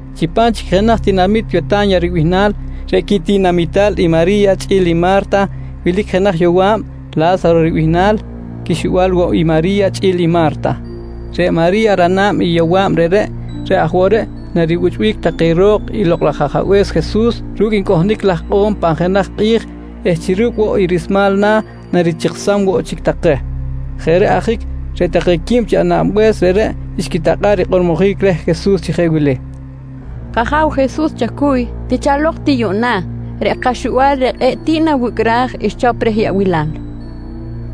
Chipam chic jenaj tinamit Weta̱nya ribihnal, reꞌ quitinamital i Mari̱ya chꞌi̱l i Ma̱rta wilic jenaj yowa̱b La̱saro ribihnal quixuba̱l woꞌ i Mari̱ya chꞌi̱l i Ma̱rta. Reꞌ Mari̱ya, rana̱b i yowa̱b reꞌreꞌ, reꞌ aj woꞌ reꞌ naribuchꞌbic take reh ro̱k i Lokꞌ laj Ajabe̱s Jesus ru̱cꞌ ncꞌohnic laj ikꞌo̱m pan jenaj kꞌi̱j eh chi ru̱cꞌ woꞌ i rismal na̱ narichiksam woꞌ chic take. Jeꞌ reꞌ ajic reꞌ take quib chi anab-be̱s reꞌreꞌ xquitakꞌa̱ꞌ rikꞌormojic reh Jesus chi jeꞌ wili: «K-Aja̱w Jesus chacuy, tichalok ti yuꞌna, reꞌ kaxubal reꞌ kꞌe̱ꞌ tiꞌ nawicꞌraj xchop reh yaꞌbilal,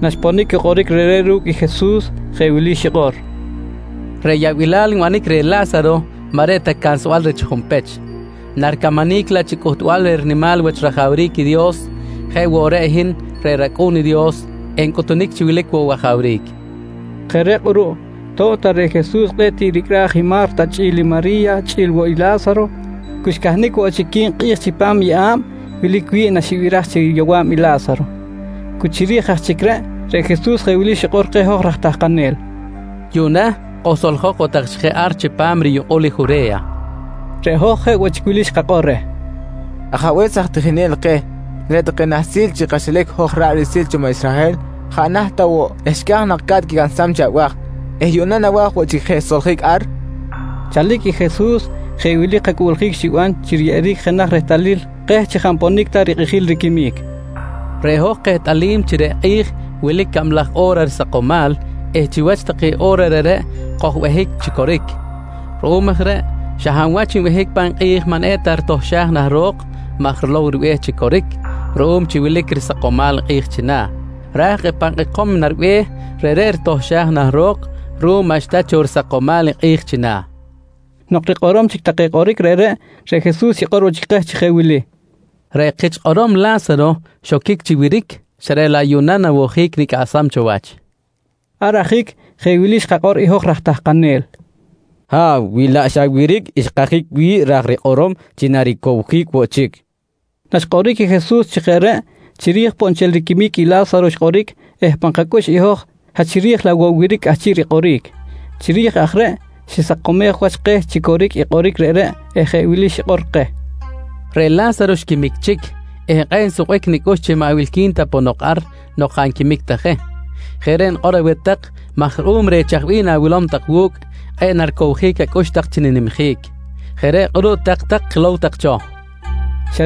nqui xquitakꞌa̱ꞌ je rikꞌormojic reh. Naxponic i kꞌoric reꞌreꞌ ru̱cꞌ i Jesus, jeꞌ wili xikꞌor: «Reꞌ yaꞌbilal nbanic reh La̱saro maꞌ reꞌ ta cansbal reh chi junpech, naricamanic laꞌ chi cꞌuhtbal reh rinimal wach rajawric i Dios jeꞌ woꞌ chi reꞌ hin reꞌ rAcꞌu̱n i Dios encꞌutunic chi wilic woꞌ wajawric, nqui Jesus. Jeꞌ reꞌ kꞌuruꞌ to̱b ta reꞌ Jesus kꞌe̱ꞌ tiꞌ ricꞌraj i Ma̱rta chꞌi̱l i Mari̱ya chꞌi̱l woꞌ i La̱saro, cu xcahnic woꞌ chic quib kꞌi̱j chipam i yeꞌa̱b wilic wi̱ꞌ naxibiraj chi yowa̱b i La̱saro. Cu chiri̱j aj chic reꞌ, reꞌ Jesus jeꞌ wili xikꞌor keh hoj raj tahkanel: «Yuꞌna kojsoljok woꞌ tak chic je ar chipam riyukꞌul i Jure̱ya, nqui xikꞌor keh. Reꞌ hoj jeꞌ wili xkakꞌor reh: «Ajabe̱s aj tijinel keh, reꞌ take nahsil chi kaxilac hoj ra̱ꞌ riꞌsil cho maꞌ Israhel jaꞌ naht ta woꞌ xca̱j nak ca̱t quicansam chi abaj eh yuꞌna nawa̱j woꞌ chic je soljic ar? kojqui reh. Chalic i Jesus jeꞌ wili kacꞌuꞌljic xiban chi riyeꞌeric jenaj rehtalil keh chi jaꞌ nponic ta rikꞌijil riquimic: «Reꞌ hoj kehtꞌalim chi reꞌ kꞌi̱j wilic cablaj o̱ra risakomal eh chiwach take o̱ra reꞌreꞌ kojbehic chi coric. Ruꞌum aj reꞌ xa hab wach nbehic pan kꞌi̱j maꞌ eta ritohxaj nah ro̱k maj rilow i ribe̱h chi coric ruꞌum wilic cho risakomal i kꞌi̱j china̱. Raj i pan kꞌekom naribe̱h reꞌreꞌ ritohxaj nah ro̱k ruꞌum maꞌxta cho risakomal i kꞌi̱j china̱, nqui xikꞌor. Nok rikꞌorom chic take kꞌoric reꞌreꞌ, reꞌ Jesus xikꞌor woꞌ chic keh chi jeꞌ wili: «Reꞌ kich kꞌorom La̱saro, xoquic chi wiric xa reꞌ laꞌ yuꞌna nawojic nicꞌaꞌsam cho wach, nqui keh. Ar ajic jeꞌ wili xkakꞌor i hoj raj tahkanel: «Ha̱w, wi laꞌ xa wiric xkajic wi̱ꞌ ra̱j rikꞌorom chi naricowjic woꞌ chic, kojqui reh. Naxkꞌoric i Jesus chi jeꞌ reꞌ, chiri̱j poꞌ nchel riquimic i La̱saro xkꞌoric eh pan kacꞌux i hoj xa chiri̱j laꞌ woꞌ wiric cꞌahchiꞌ rikꞌoric. Chiri̱j aj reꞌ xisakomej wach keh chi coric i kꞌoric reꞌreꞌ eh jeꞌ wili xikꞌor keh: «Reꞌ La̱saro xquimic chic eh kꞌe̱ꞌ nsukbic nicꞌux chi maꞌ wilqui̱n ta ponok ar nok jaꞌ nquimic ta je. Jeꞌ reꞌ nikꞌor aweh tak maj ruꞌum reh i chaj bih na̱wilom tak wu̱cꞌ, kꞌe̱ꞌ naricowjic acꞌux tak chi ninimjic. Jeꞌ reꞌ kꞌuruꞌ tak-tak, kilow tak cho, nqui keh Jesus.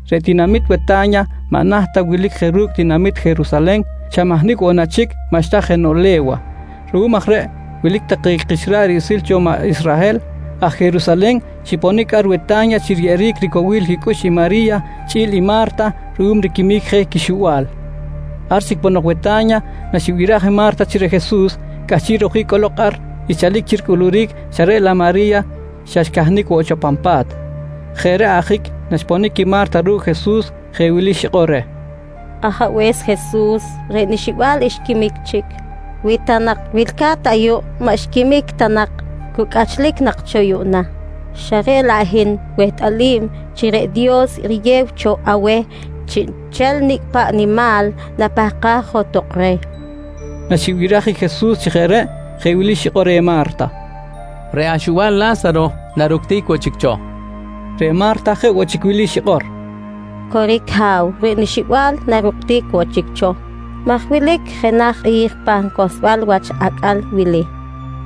Reꞌ tinamit Weta̱nya maꞌ naht ta wilic je ru̱cꞌ tinamit Jerusalen, xa mahnicꞌ woꞌ na chic maꞌxta jenoꞌ le̱wa. Ruꞌum aj reꞌ, wilic take kich ra̱ꞌ riꞌsil cho maꞌ Israhel aj Jerusalen xiponic ar Weta̱nya chi riyeꞌeric ricowil quicꞌux i Mari̱ya chꞌi̱l i Ma̱rta ruꞌum riquimic je i quixuba̱l. Ar chic ponok Weta̱nya, naxibiraj i Ma̱rta chi reꞌ Jesus cꞌahchiꞌ rojic cꞌolok ar xchalic chi ricꞌuluric xa reꞌ laꞌ Mari̱ya xa xcahnic woꞌ cho pan pa̱t. Jeꞌ reꞌ ajic, naxponic i Ma̱rta ru̱cꞌ Jesus jeꞌ wili xikꞌor reh: «Ajabe̱s Jesus, reꞌ nixubal xquimic chic. Wi ta nak wilca̱t ayuꞌ maꞌ xquimic ta nak, cu cꞌachlic nak cho yuꞌna. Xa reꞌ laꞌ reꞌ hin wehtꞌalim chi reꞌ Dios riyew cho aweh chiꞌnchel nicꞌ paꞌ nimal napahkaj johtok reh, nqui Ma̱rta. Naxibiraj i Jesus chi jeꞌ reꞌ, jeꞌ wili xikꞌor reh Ma̱rta: «Reꞌ axubal La̱saro, naructic woꞌ chic cho, nqui Jesus. Reꞌ Ma̱rta jeꞌ woꞌ chic wili xikꞌor: «Coric Ha̱w, reꞌ nixubal naructic woꞌ chic cho maj wilic jenaj kꞌi̱j pan cohlsbal wach acꞌal wili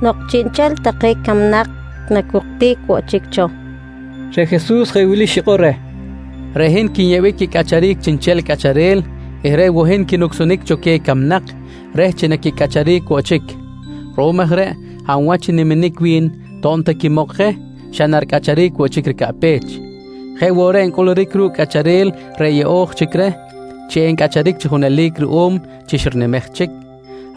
nok chiꞌnchel take camnak nacuctic woꞌ chic cho, nqui reh. Reꞌ Jesus jeꞌ wili xikꞌor reh: «Reꞌ hin i quinyeꞌbic quicꞌacharic chiꞌnchel cꞌacharel eh reꞌ woꞌ hin quinucsunic cho queh camnak reh chi naquicꞌacharic woꞌ chic. Ruꞌum aj reꞌ hab wach n-niminic wi̱n to̱b ta quimok je xa na ricꞌacharic woꞌ chic ricaꞌpech. Jeꞌ woꞌ reꞌ ncꞌuluric ru̱cꞌ i cꞌacharel reꞌ yeꞌo̱j chic reh chi encꞌacharic chi junelic ruꞌum chi xirinimej chic,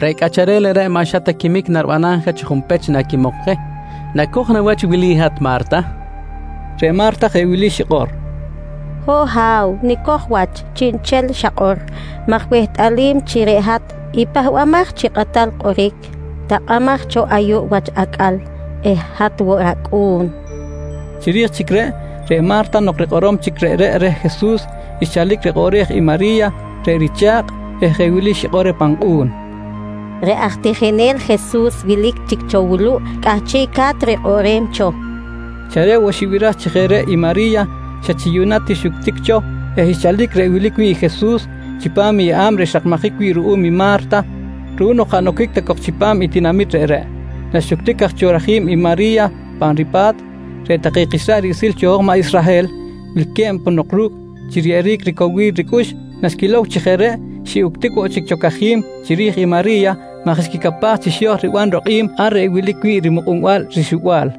reꞌ cꞌacharel reꞌreꞌ maꞌ xa quimic naribanam je chi junpech naquimok je. Nacoj na wach wili i hat Ma̱rta? nqui Jesus reh. Reꞌ Ma̱rta jeꞌ wili xikꞌor: «Ho̱ꞌ Ha̱w, nicoj wach chiꞌnchel xakꞌor maj wehtꞌalim chi reꞌ hat i Pahbamaj chi Kꞌatal Kꞌoric takꞌamaj cho ayuꞌ wach acꞌal eh hat woꞌ rAcꞌu̱n, nqui reh. Chiri̱j chic reꞌ, reꞌ Ma̱rta nok rikꞌorom chic reꞌreꞌ reh Jesus, xchalic rikꞌoꞌrej i Mari̱ya reꞌ richa̱kꞌ eh jeꞌ wili xikꞌor reh pan kꞌu̱n: «Reꞌ aj Tijinel Jesus wilic chic cho wuluꞌ cꞌahchiꞌca̱t rikꞌoꞌrem cho, nqui reh. Xa reꞌ woꞌ xibiraj chi jeꞌ reꞌ i Mari̱ya xa chi yuꞌna ti xuctic cho eh xchalic reꞌ wilic wi̱ꞌ i Jesus chipam i yeꞌa̱b reꞌ xrakmajic wi̱ꞌ ruꞌum i Ma̱rta, ruꞌum nok jaꞌ noquic ta nak cok chipam i tinamit reꞌreꞌ. Naxuctic aj cho rajim i Mari̱ya pa ripa̱t, reꞌ take kich ra̱ꞌ riꞌsil cho maꞌ Israhel wilque̱b ponok ru̱cꞌ chi riyeꞌeric ricowil ricꞌux, naxquilow chi jeꞌ reꞌ xiꞌuctic woꞌ chic cho cajim chiri̱j i Mari̱ya maj xquicapaj chi xo̱j riban rokꞌim ar reꞌ wilic wi̱ꞌ rimukꞌunbal rixuba̱l.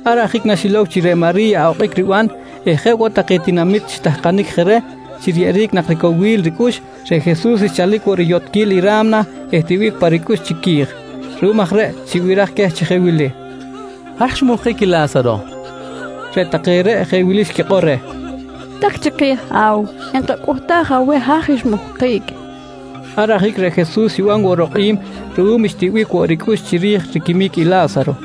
Ar ajic naxilow chi reꞌ Mari̱ya okꞌic riban eh jeꞌ woꞌ take tinamit xitahkanic je reh chi riyeꞌeric nak ricowil ricꞌux, reꞌ Jesus xchalic woꞌ riyotꞌquil i ra̱mna eh tiꞌbic pa ricꞌux chiqui̱j. Ruꞌum aj reꞌ xibiraj queh chi jeꞌ wili: «Haj xmuhkic i La̱saro? nqui queh. Reꞌ take reꞌ jeꞌ wili xquikꞌor reh: «Tak chiki̱j Ha̱w, enkacꞌuhtaj aweh haj xmuhkic, nqui take reh. Ar ajic reꞌ Jesus xiban rokꞌim ruꞌum xtiꞌbic woꞌ ricꞌux chiri̱j riquimic i La̱saro.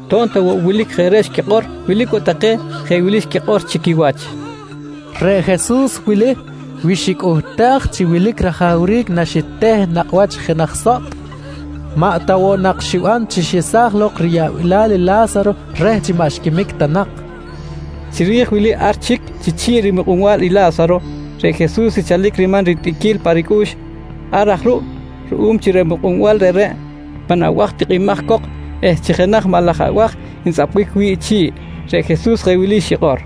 To̱b ta woꞌ wilic jeꞌ reꞌ xquikꞌor, wilic woꞌ take jeꞌ wili xquikꞌor chi quiwach: «Reꞌ Jesus wili wi xicꞌuhtaj chi wilic rajawric naxiteh i nakꞌ wach i jenaj sotꞌ, maꞌ ta woꞌ nak xiban chi xesaj lok riyaꞌbilal i La̱saro reh chi maꞌ xquimic ta nak? nqui take. Chiri̱j wili ar chic chi chi̱ꞌ rimukꞌunbal i La̱saro, reꞌ Jesus xchalic riman ritiꞌquil pa ricꞌux. Ar aj ruꞌ ruꞌum chi reꞌ mukꞌunbal reꞌreꞌ pan abaj tikꞌimaj cok eh chi jenaj maꞌ laj abaj ntzꞌapbic wi̱ꞌ chi̱ꞌ, reꞌ Jesus jeꞌ wili xikꞌor: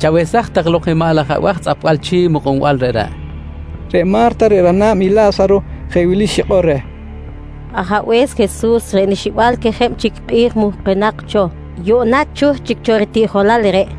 «Chawesaj tak lok i maꞌ laj abaj tzꞌapbal chi̱ꞌ i mukꞌunbal reꞌreꞌ, nqui. Reꞌ Ma̱rta reꞌ rana̱b i La̱saro jeꞌ wili xikꞌor reh: «Ajabe̱s Jesus, reꞌ nixubal quejeb chic kꞌi̱j muhkunak cho, yuꞌna chuh chic cho ritiꞌjolal reꞌ, nqui reh.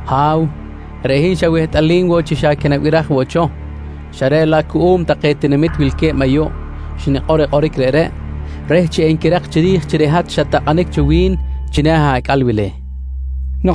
Ha̱w, reꞌ hin xa wehtꞌalim woꞌ chi xa quinabiraj woꞌ cho xa reꞌ laꞌ cuꞌum take tinamit wilque̱b ayuꞌ xnikꞌor i kꞌoric reꞌreꞌ reh chi enquirak chiri̱j chi reꞌ hat xat-takꞌanic cho wi̱n china̱ acꞌal wili, nqui xikꞌor.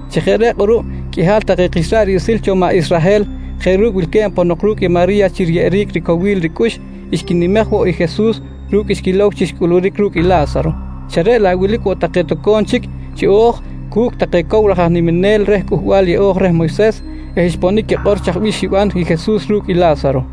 Chi jeꞌ reꞌ kꞌuruꞌ qꞌuihal take kich ra̱ꞌ riꞌsil cho maꞌ Israhel jeꞌ ru̱cꞌ wilque̱b ponok ru̱cꞌ i Mari̱ya chi riyeꞌeric ricowil ricꞌux, xquinimej woꞌ i Jesus ru̱cꞌ xquilow chi xcꞌuluric ru̱cꞌ i La̱saro, xa reꞌ laꞌ wilic woꞌ take toco̱m chic xiꞌo̱j cu̱cꞌ take cow laj aj niminel reh Cꞌuhbal Yeꞌo̱j reh Moyses eh xponic quikꞌor chaj bih xiban i Jesus ru̱cꞌ i La̱saro.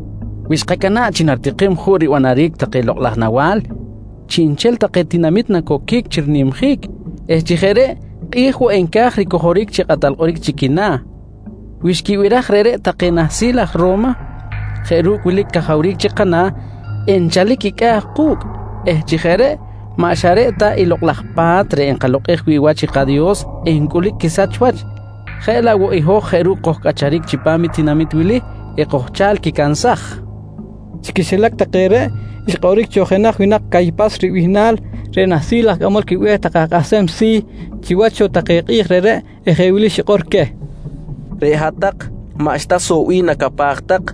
Wi xkacana̱ꞌ chi naritikim juꞌ ribanaric take lokꞌ laj nawa̱l, chiꞌnchel tinamit nacoquic chi rinimjic eh chi jeꞌ reꞌ kꞌi̱j woꞌ enca̱j ricojoric chi kꞌatal kꞌoric chi quina̱. Wi xquibiraj reꞌreꞌ take nahsil aj Ro̱ma jeꞌ ru̱cꞌ wilic cajawric chi kana̱, enchalic quicꞌa̱ ku̱cꞌ eh chi jeꞌ reꞌ maꞌ xa reꞌ ta i lokꞌ laj Pa̱t reꞌ nkalokꞌej wi̱ꞌ wach i kaDios encꞌulic quisach wach jeꞌ laꞌ woꞌ i hoj jeꞌ ru̱cꞌ kojcꞌacharic chipam i tinamit wili ekojchal quicansaj, nqui take. Chi quixilac take reꞌ, xkꞌoric cho jenaj winak Caypas ribihnal reꞌ nahsil aj cꞌamol quibe̱h take aj kꞌahsem si̱ chiwach cho take kꞌi̱j reꞌreꞌ eh jeꞌ wili xikꞌor queh: «Reꞌ hat-tak maꞌxta soꞌ bih nacapaj tak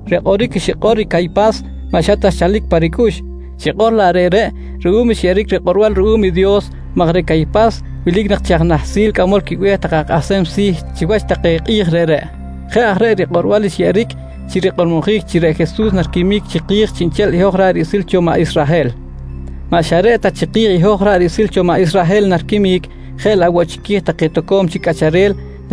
Reꞌ kꞌoric xikꞌor i Caypas maꞌ xa ta xchalic pa ricꞌux, xikꞌor laꞌ reꞌreꞌ ruꞌum xyeꞌeric rikꞌorbal ruꞌum i Dios maj reꞌ Caypas wilic nak chi aj nahsil cꞌamol quibe̱h take aj kꞌahsem si̱ chiwach take kꞌi̱j reꞌreꞌ. Jeꞌ aj reꞌ rikꞌorbal xyeꞌeric chi rikꞌormojic chi reꞌ Jesus nariquimic chiki̱j chiꞌnchel i hoj ra̱ꞌ riꞌsil cho maꞌ Israhel. Maꞌ xa reꞌ ta chiki̱j i hoj ra̱ꞌ riꞌsil cho maꞌ Israhel nariquimic, jeꞌ laꞌ woꞌ chiqui̱j take toco̱m chic cꞌacharel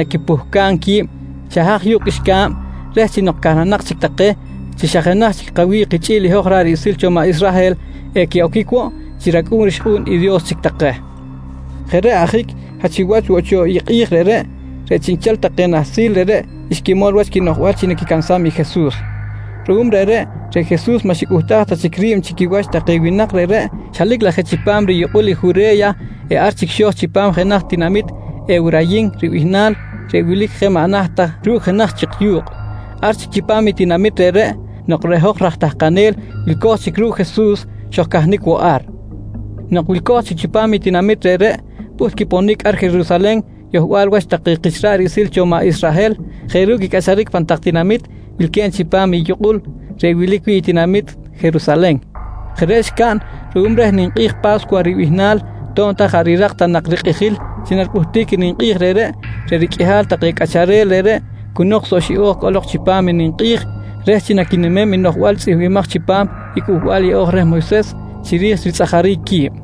quipuhcam qui̱b xa haj yu̱kꞌ qꞌuixca̱b reh chi nok cahnanak chic take chi xa jenaj kawi̱ꞌ kichꞌi̱l i hoj ra̱ꞌ riꞌsil cho maꞌ Israhel, equiꞌoquic woꞌ chi racꞌu̱n rixkꞌu̱n i Dios chic take. Jeꞌ reꞌ ajic xa chiwach woꞌ cho i kꞌi̱j reꞌreꞌ, reꞌ chiꞌnchel take nahsil reꞌreꞌ xquimol wach quinoꞌjbal chi naquicansam i Jesus. Ruꞌum reꞌreꞌ, reꞌ Jesus maꞌ xicꞌuhtaj ta chic ri̱b chi quiwach take winak reꞌreꞌ, xelic laꞌ je chipam riyukꞌul i Jure̱ya eh ar chic xo̱j chipam jenaj tinamit Ewrayin ribihnal reꞌ wilic je maꞌ naht ta ru̱cꞌ jenaj chik yu̱kꞌ. Ar chic chipam i tinamit reꞌreꞌ, nok reꞌ hoj raj tahkanel wilco̱j chic ru̱cꞌ Jesus xojcahnic woꞌ ar. Nok wilco̱j chic chipam i tinamit reꞌreꞌ, pꞌuht quiponic ar Jerusalen yohbal wach take kich ra̱ꞌ riꞌsil cho maꞌ Israhel jeꞌ ru̱cꞌ quicꞌacharic pan tak tinamit wilque̱b chipam i yukꞌul reꞌ wilic wi̱ꞌ i tinamit Jerusalen. Jeꞌ reꞌ xcaꞌn ruꞌum reh ninkꞌi̱j Pa̱scuwa ribihnal. To̱b ta jaꞌ rirak ta nak rikꞌijil chi naripꞌuhtic i ninkꞌi̱j reꞌreꞌ, reꞌ riqꞌuihal take cꞌacharel reꞌreꞌ cu nok soꞌ xiꞌo̱j cꞌolok chipam i ninkꞌi̱j reh chi naquinimem i noꞌjbal tzꞌihmbimaj chipam i Cꞌuhbal Yeꞌo̱j reh Moyses chiri̱j ritzꞌajaric qui̱b.